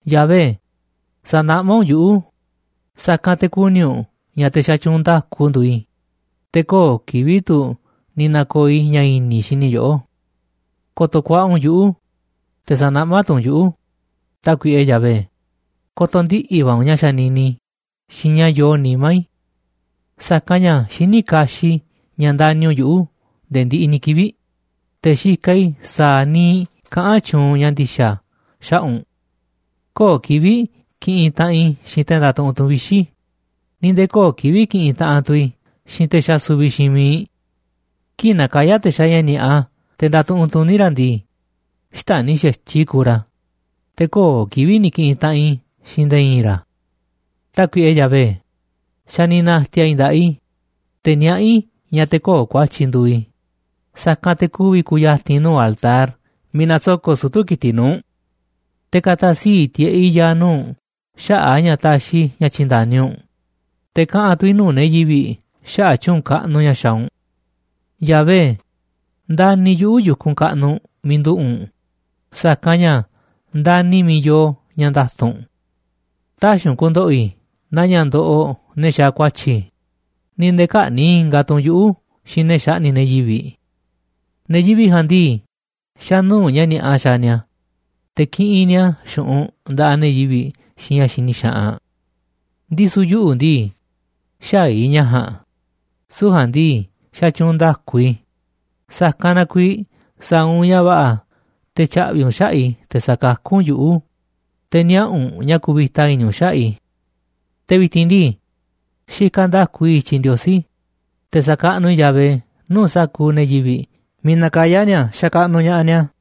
Yahvé, sa̱naꞌmá u̱nꞌ yuꞌu̱, sa̱kanꞌ te̱ ku̱ni̱ u̱nꞌ ña̱ te̱ xatyuunꞌ nda̱ku nduuꞌ i̱, te̱ köo̱ꞌ kivi̱ꞌ tu̱ ni̱ na̱ko̱o̱ i̱ ña̱ i̱ni̱ i̱ xini i̱ yoꞌó. Ko̱to̱ ku̱a̱ꞌa̱ u̱nꞌ yuꞌu̱, te̱ sa̱naꞌmá tu̱ u̱nꞌ yuꞌu̱, Tákuiꞌe Yahvé, ko̱to̱ ndiꞌi̱ va̱ u̱nꞌ ña̱ xanini i̱ xiinꞌ ña̱ yoo nimá i̱. Sa̱kanꞌ ña̱ xiní kaxiꞌ i̱ ña̱ ndani̱ u̱nꞌ yuꞌu̱ nde̱e̱ ndiꞌiꞌ ni̱ kivi̱ꞌ, te̱ xikaꞌ i̱ sa̱a̱ niiꞌ kaꞌán tyuunꞌ ña̱ ndi̱xa̱ xaꞌa̱ꞌ u̱nꞌ. Köo̱ꞌ kivi̱ꞌ kiꞌinꞌ taꞌanꞌ i̱ xiinꞌ te̱ ndatuꞌunꞌ tu̱n vixi̱, ni̱ nde̱e̱ köo̱ꞌ kivi̱ꞌ kiꞌinꞌ taꞌanꞌ tu̱ i̱ xiinꞌ te̱ xasuviꞌ xiinꞌ miiꞌ. Kii̱ꞌ nakayá te̱ xaaꞌ ña̱ ni̱a̱ꞌa te̱ ndatuꞌunꞌ tuní ra̱ ndii, xtäni̱ i̱ xa̱tyiꞌ i̱ kuuꞌ ra̱, te̱ köo̱ꞌ kivi̱ꞌ ni̱ ki̱ꞌi̱n taꞌanꞌ i̱ xiinꞌ nde̱e̱ i̱i̱n ra̱. Tákuiꞌe Yahvé, xa̱ ni̱ na̱ti̱a̱ i̱ nda̱ꞌaꞌ i̱, te̱ niaꞌá i̱ ña̱ te̱ köo̱ꞌ ku̱a̱tyi̱ nduuꞌ i̱, sa̱kanꞌ te̱ ku̱vi̱ ku̱ya̱ti̱n i̱ nuu̱ꞌ altar miiꞌ nasoko̱ꞌ sutu̱ ki̱tiꞌ nuu̱ꞌ u̱nꞌ. Te̱ ka̱ta̱ sii̱ꞌ tiꞌeꞌ i̱ ya̱a̱ nuu̱ꞌ u̱nꞌ xaꞌa̱ꞌ a̱ ña̱ taxiꞌ i̱ ña̱ tyi̱nda̱ni u̱nꞌ, te̱ kaꞌa̱n tu̱ i̱ nuu̱ꞌ ne̱ yivi̱ꞌ xaꞌa̱ꞌ tyu̱u̱n kaꞌnuꞌ ña̱ xaaꞌ u̱nꞌ. Yahvé, ndani̱ yuꞌu̱ yu̱kunꞌ kaꞌnuꞌ miiꞌ nduꞌu̱ꞌ u̱nꞌ, sa̱kanꞌ ña̱ ndani̱ i̱ miiꞌ yoo ña̱ nda̱tu̱nꞌ u̱nꞌ. Tä̱xi̱ u̱nꞌ ku̱ndo̱ꞌo̱ i̱ naa ña̱ ndoꞌoꞌ ne̱ xaaꞌ ku̱a̱tyi̱, ni̱ nde̱e̱ kä̱ꞌni̱ꞌ ingaꞌ tu̱ u̱nꞌ yuꞌu̱ xiinꞌ ne̱ xaꞌni̱ꞌ ne̱ yivi̱ꞌ. Ne̱ yivi̱ꞌ ja̱a̱nꞌ ndii, xa̱ nuu̱ꞌ ña̱ ni̱a̱ꞌa xaaꞌ ni̱a̱, te̱ kiꞌinꞌ ni̱a̱ xu̱ꞌunꞌ nda̱ꞌaꞌ ne̱ yivi̱ꞌ xiinꞌ ña̱ xini xaꞌanꞌ. Ndisu̱ yuꞌu̱ ndii, xäaꞌ i̱ ña̱ ja̱a̱nꞌ, süu̱ꞌ ja̱a̱nꞌ ndii, xatyuunꞌ nda̱ku i̱, sa̱kanꞌ na kuiiꞌ sa̱a̱ u̱nꞌ ña̱ va̱ꞌa̱ te̱ tya̱ꞌvi̱ u̱nꞌ xaꞌa̱ꞌ i̱, te̱ sa̱kakú u̱nꞌ yuꞌu̱, te̱ niaꞌa̱ u̱nꞌ ña̱ kuvita i̱ni̱ u̱nꞌ xaꞌa̱ꞌ i̱. Te̱ vi̱ti̱n ndii, xikaꞌ nda̱ku i̱ i̱tyiꞌ Ndiosí, te̱ sa̱kaꞌnuꞌ i̱ Yahvé nuu̱ꞌ sa̱kuuꞌ ne̱ yivi̱ꞌ miiꞌ nakayá ni̱a̱ xakaꞌnuꞌ ña̱ꞌaꞌ ni̱a̱.